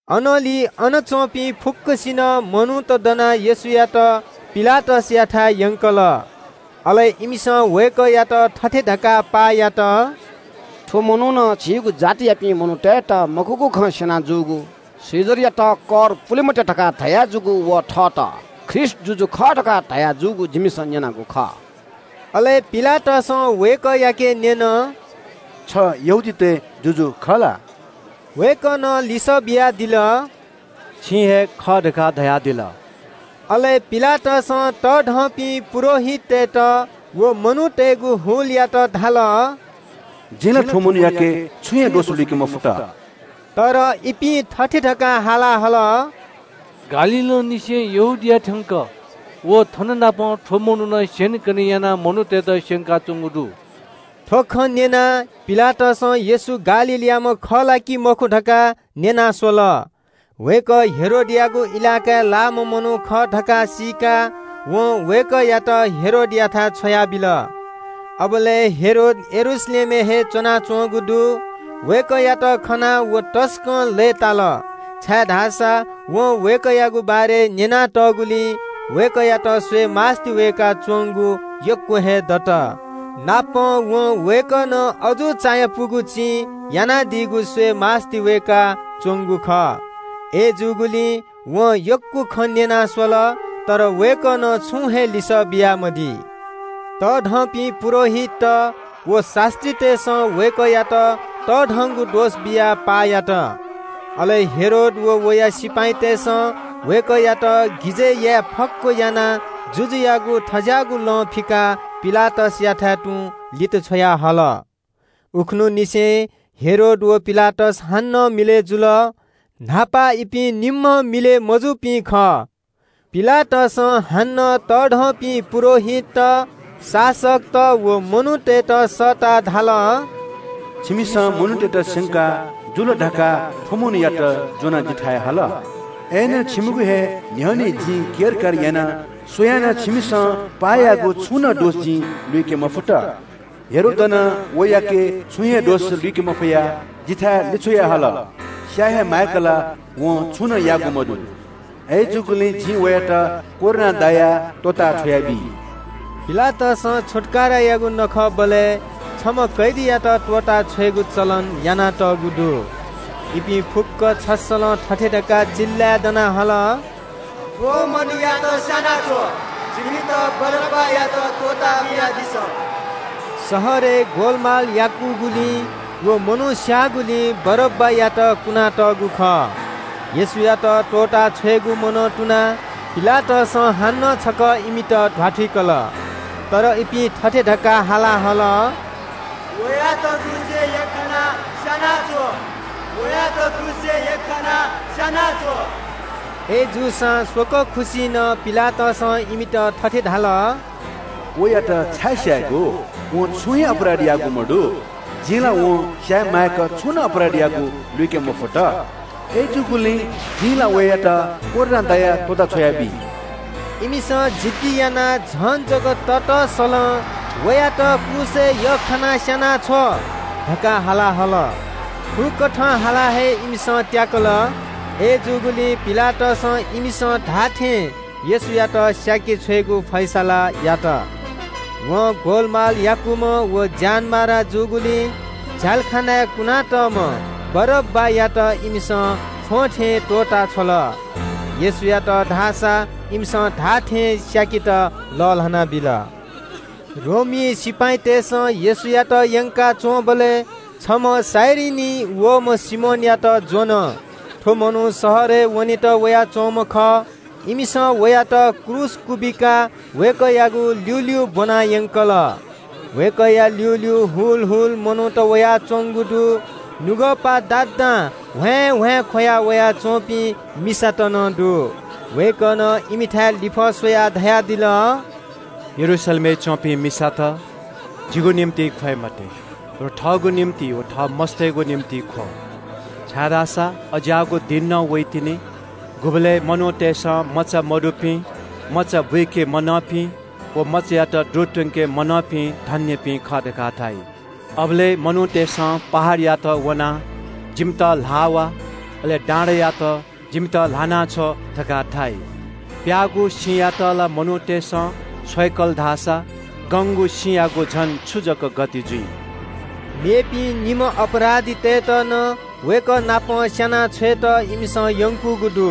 अनंलि अन च्‍वंपिं फुक्‍क मनूत दनाः येशूयात पिलातसयाथाय् यंकल। अले इमिसं वय्‌कःयात थथे धकाः पाः यात – “थ्‍व मनुखं जिमिगु जातियापिं मनूतय्‌त मखुगु खँ स्‍यना जूगु, कैसरयात कर पुले मते धकाः धयाजूगु व थःत ख्रीष्‍ट जुजु खः धकाः धयाजूगु जिमिसं न्‍यनागु खः।” अले पिलातसं वय्‌कःयाके न्‍यन – “छ यहूदीतय् जुजु खः ला?” वय्‌कलं लिसः बियादिल – “छिं हे खः धकाः धयादिल।” अले पिलातसं तःधंपिं पुजाहारीतय्‌त व मनूतय्‌गु हुलयात धाल – “जिं ला थ्‍व मनूयाके छुं हे दोष लुइके मफुत।” अय्‌नं इपिं थथे धकाः झन हाला हल – “गालीलंनिसें यहूदिया थ्‍यंक व थननापं थ्‍व मनुखं स्‍यनेकने यानाः मनूतय्‌त स्‍यंकाच्‍वंगु दु।” थ्‍व खँ न्‍यनाः पिलातसं येशू गालीलयाम्‍ह खः ला कि मखु धकाः न्‍यना स्‍वल। वय्‌कः हेरोदयागु इलाकाय् लाःम्‍ह मनू खः धकाः सीकाः वं वय्‌कःयात हेरोदयाथाय् छ्वयाबिल। अबलय् हेरोद यरूशलेमय् हे च्‍वनाच्‍वंगु दु। वय्‌कःयात खनाः हेरोद तसकं लय्‌ताल, छाय्‌धाःसा वं वय्‌कःयागु बारे न्‍यनातःगुलिं वय्‌कःयात स्‍वयेमास्‍ति वय्‌काच्‍वंगु यक्‍व हे दत। नापं वं वय्‌कलं अजू चायापुगु चिं यानादीगु स्‍वयेगु आशा यानाच्‍वंगु खः। अय्‌जूगुलिं वं यक्‍व खँ न्‍यना स्‍वल, तर वय्‌कलं छुं हे लिसः बियामदी। तःधंपिं पुजाहारीत व शास्‍त्रीतय्‌सं वय्‌कःयात तःधंगु दोष बियाः पाः यात। अले हेरोद व वया सिपाइँतय्‌सं वय्‌कःयात गिजय् याये फक्‍व यानाः जुजुयागु थें ज्‍याःगु लं फिकाः पिलातसयाथाय् तुं लित छ्वयाहल। उखुन्‍हुंनिसें हेरोद व पिलातस हानं मिलय् जुल। न्‍हापा इपिं निम्‍ह मिलय् मजूपिं खः। पिलातसं हानं तःधंपिं पुजाहारीत, शासकत व मनूतय्‌त सःताः धाल – “छिमिसं मनूतय्‌त स्‍यंका जुल धकाः थ्‍व मनूयात ज्‍वनाः जिथाय् हल, अय्‌नं छिमिगु हे न्‍ह्यःने जिं केरकार याना स्‍वयां नं छिमिसं पाः याःगु छुं नं दोष जिं लुइके मफुत। हेरोदं नं वयाके छुं हे दोष लुइके मफयाः जिथाय् लिछ्वयाहल। स्‍याये हे माय्‌क ला वं छुं नं याःगु मदु। अय्‌जूगुलिं जिं वयात कोर्रां दायाः त्‍वःता छ्वयाबी।” पिलातसं छुत्‍कारायागु नखःबलय् छम्‍ह कैदीयात त्‍वःताछ्वयेगु चलन यानातःगु दु। इपिं फुक्‍कं छस्‍सलं थथे धकाः चिल्‍लाय् दना हाला हल – “थ्‍व मनूयात स्‍यानाछ्व, जिमित बारब्‍बायात त्‍वःता बियादिसँ।” शहरय् ग्‍वलमाल याकूगुलिं व मनू स्‍याःगुलिं बारब्‍बायात कुना तःगु खः। येशूयात त्‍वःताछ्वयेगु मनं तुनाः पिलातसं हानं छकः इमित ध्‍वाथुइकल। अय्‌नं इपिं थथे धकाः हाला हल – “वयात क्रूसय् यख्‍खानाः स्‍यानाछ्व, वयात क्रूसय् यख्‍खानाः स्‍यानाछ्व।” अय्‌जूसां स्‍वकः खुसि नं पिलातसं इमित थथे धाल – “वयात छाय् स्‍यायेगु? वं छुं हे अपराध याःगु मदु। वं स्‍याये माय्‌क छुं नं अपराध याःगु जिं लुइके मफुत। अय्‌जूगुलिं जिं ला वयात कोर्रां दायाः त्‍वःता छ्वयाबी।” इमिसं जिद्दी यानाः झन जक ततःसलं “वयात क्रूसय् यख्‍खानाः स्‍यानाछ्व” धकाः हाला हल। थुकथं हालाः हे इमिसं त्‍याकल। अय्‌जूगुलिं पिलातसं इमिसं धाःथें येशूयात स्‍याके छ्वयेगु फैसला यात। वं ग्‍वलमाल याकूम्‍ह व ज्‍यानमारा जूगुलिं झ्‍यालखानाय् कुनातःम्‍ह बारब्‍बायात इमिसं फ्‍वंथें त्‍वःता छ्वल। येशूयात धाःसा इमिसं धाःथें स्‍याकेत लःल्‍हाना बिल। रोमी सिपाइँतय्‌सं येशूयात यंकाच्‍वंबलय् छम्‍ह कुरेनीं वःम्‍ह सिमोनयात ज्‍वन। थ्‍व मनू शहरय् वनेत वयाच्‍वंम्‍ह खः। इमिसं वयात क्रूस क्‍वबिकाः वय्‌कःयागु ल्‍यूल्‍यू ब्‍वनायंकल। वय्‌कःया ल्‍यूल्‍यू ग्‍वाः ग्‍वाः मनूत वयाच्‍वंगु दु। नुगःपा दादां ह्वाँय्‌ह्वाँय् ख्‍वया वयाच्‍वंपिं मिसात नं दु। वय्‌कलं इमिथाय् लिफः स्‍वयाः धयादिल – “यरूशलेमय् च्‍वंपिं मिसात, जिगु निंतिं ख्‍वये मते, बरु थःगु निंतिं व थः मस्‍तय्‌गु निंतिं ख्‍व। छाय्‌धाःसा अज्‍याःगु दिं नं वइतिनि, गुबलय् मनूतय्‌सं मचा मदुपिं, मचा बुइके मलंपिं व मचायात दुरु त्‍वंके मलंपिं धन्‍यपिं खः धकाः धाइ। अबलय् “‘मनूतय्‌सं पहाडयात वनाः “जिमित ल्‍हाः वा।” अले डाँडायात – “जिमित ल्‍हाना छ्व” धकाः धाइ।’ “प्‍याःगु सिमायात ला मनूतय्‌सं छ्वय्‌कल धाःसा गंगु सिमायागु झन छु जक गति जुइ?” मेपिं निम्‍ह अपराधीतय्‌त नं वय्‌कः नाप स्‍याना छ्वयेत इमिसं यंकूगु दु।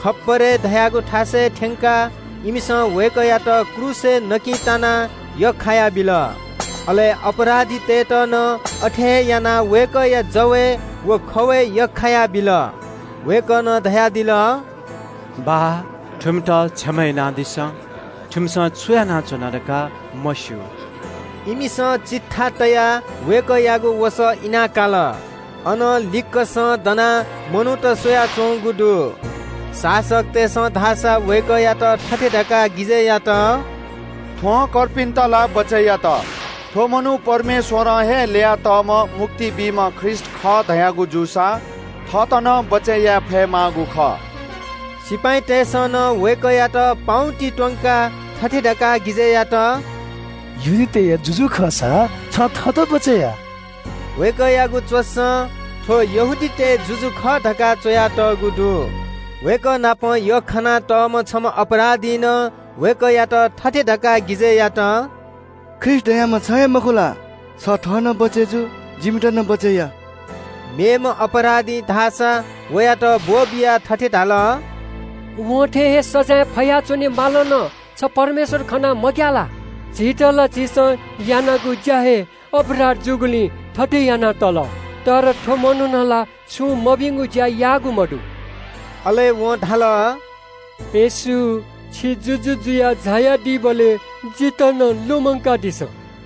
“खप्‍परे” धाःगु थासय् थ्‍यंकाः इमिसं वय्‌कःयात क्रूसय् नकिं तानाः यख्‍खायाबिल। अले अपराधीतय्‌त नं अथे हे यानाः वय्‌कःया जवय् व खवय् यख्‍खायाबिल। वय्‌कलं धयादिल – “बाः, थुमित क्षमा यानादिसँ। थुमिसं छु यानाच्‍वना धकाः मस्‍यू।” सिपाइँतय्‌सं चिट्ठा तयाः वय्‌कःयागु वसः इना काल। अन लिक्‍कसं दनाः मनूत स्‍वयाच्‍वंगु दु। शासकतय्‌सं धाःसा वय्‌कःयात थथे धकाः गिजय् यात – “थ्‍वं कर्पिन्‍त ला बचय् यात, थ्‍व मनू परमेश्‍वरं हे ल्‍ययातःम्‍ह मुक्ति बीम्‍ह ख्रीष्‍ट खः धयागु जूसा थःत नं बचय् याये फयेमाःगु खः।” सिपाइँतय्‌सं नं वय्‌कःयात पाउँति त्‍वंकाः थथे धकाः गिजय् यात – “यहूदीतय् जुजु खःसा छं थःत बचय् या।” वय्‌कःयागु च्‍वसं – “थ्‍व यहूदीतय् जुजु खः” धकाः द्वपं पौ यख्‍खानातःगु दु। वय्‌कः नाप यख्‍खानातःम्‍ह छम्‍ह अपराधीं नं वय्‌कःयात थथे धकाः गिजय् यात – “ख्रीष्‍ट धाःम्‍ह छ हे मखु ला? छ थः नं बचय् जु जिमित नं बचय् या।” मेम्‍ह अपराधीं धाःसा वयात ब्‍वःबियाः थथे धाल – “वं थे हे सजाँय फयाच्‍वने मालं नं छ परमेश्‍वर खनाः मग्‍याः ला? झीत ला झीसं यानागु ज्‍या हे अपराध जूगुलिं थथे याना तल, अय्‌नं थ्‍व मनुखं ला छुं मभिंगु ज्‍या याःगु मदु।” अले वं धाल – “येशू, छि जुजु जुयाः झायादीबलय् जितः नं लुमंकादिसँ।”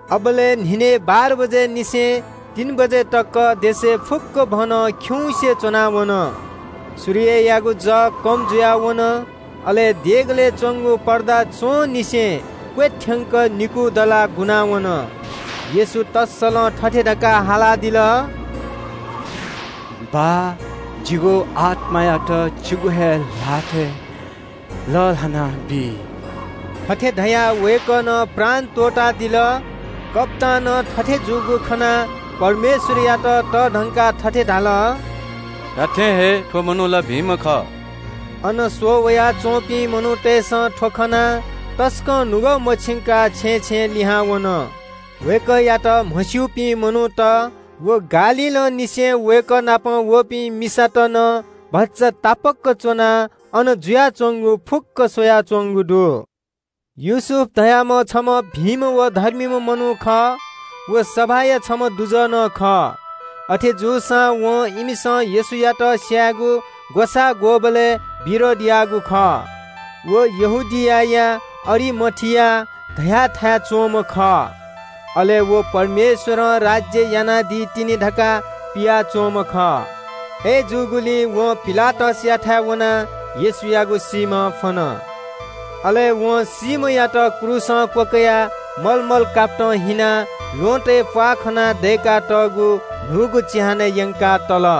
अबलय् न्‍हिनय् बाह्र बजेनिसें तीन बजे तक देशय् फुक्‍कभनं खिउँसे च्‍वना वन। सूर्य खिउँसे च्‍वना वन। अले देगलय् च्‍वंगु पर्दा च्‍वंनिसें क्‍वथ्‍यंक निकू दलाः गुना वन। येशू तःसलं थथे धकाः हालादिल – “बाः, जिगु आत्‍मायात छिगु हे ल्‍हातय् लःल्‍हानाबी।” थथे धयाः वय्‌कलं प्राण त्‍वःतादिल। रोमी कप्‍तानं थथे जूगु खनाः परमेश्‍वरयात तःधंकाः थथे धाल – “धात्‍थें हे, थ्‍व मनू ला भिंम्‍ह खः।” अन स्‍वः वयाच्‍वंपिं मनूतय्‌सं थ्‍व खनाः तसकं नुगः मछिंकाः छेँय् छेँय् लिहां वन। वय्‌कःयात म्‍हस्‍यूपिं मनूत व गालीलंनिसें वय्‌कः नाप वःपिं मिसात नं भचा तापाक च्‍वनाः अन जुयाच्‍वंगु फुक्‍क स्‍वयाच्‍वंगु दु। योसेफ धाःम्‍ह छम्‍ह भिंम्‍ह व धर्मीम्‍ह मनू खः। व सभाया छम्‍ह दुजः नं खः। अथे जूसां वं इमिसं येशूयात स्‍यायेगु ग्‍वसाः ग्‍वःबलय् विरोध याःगु खः। व यहूदियाया अरिमाथिया धयाथाय् च्‍वंम्‍ह खः। अले व परमेश्‍वरं राज्‍य यानादी तिनि धकाः पियाच्‍वंम्‍ह खः। आः वं पिलातसयाथाय् वनाः येशूयागु सीम्‍ह फ्‍वन। अले वं सीम्‍हयात क्रूसं क्‍वकयाः भिंगु सुति कापतं हिनाः ल्‍वहँतय् प्‍वाः खना दय्‌कातःगु न्‍हूगु चिहानय् यंकाः तल।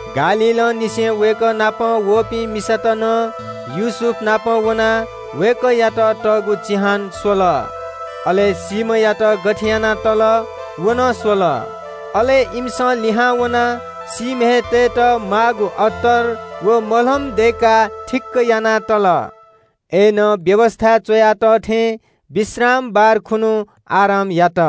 गालीलंनिसें वय्‌कः नाप वःपिं मिसात नं योसेफनापं वनाः वय्‌कःयात तःगु चिहान स्‍वल। अले सीम्‍हयात गथे यानाः तल, व नं स्‍वल। अले इमिसं लिहां वनाः सीम्‍हय् तयेत माःगु अत्तर व मलम दय्‌काः थिक्‍क याना तल। अय्‌नं व्‍यवस्‍थाय् च्‍वया तः थें शबाथ खुन्‍हु आराम यात।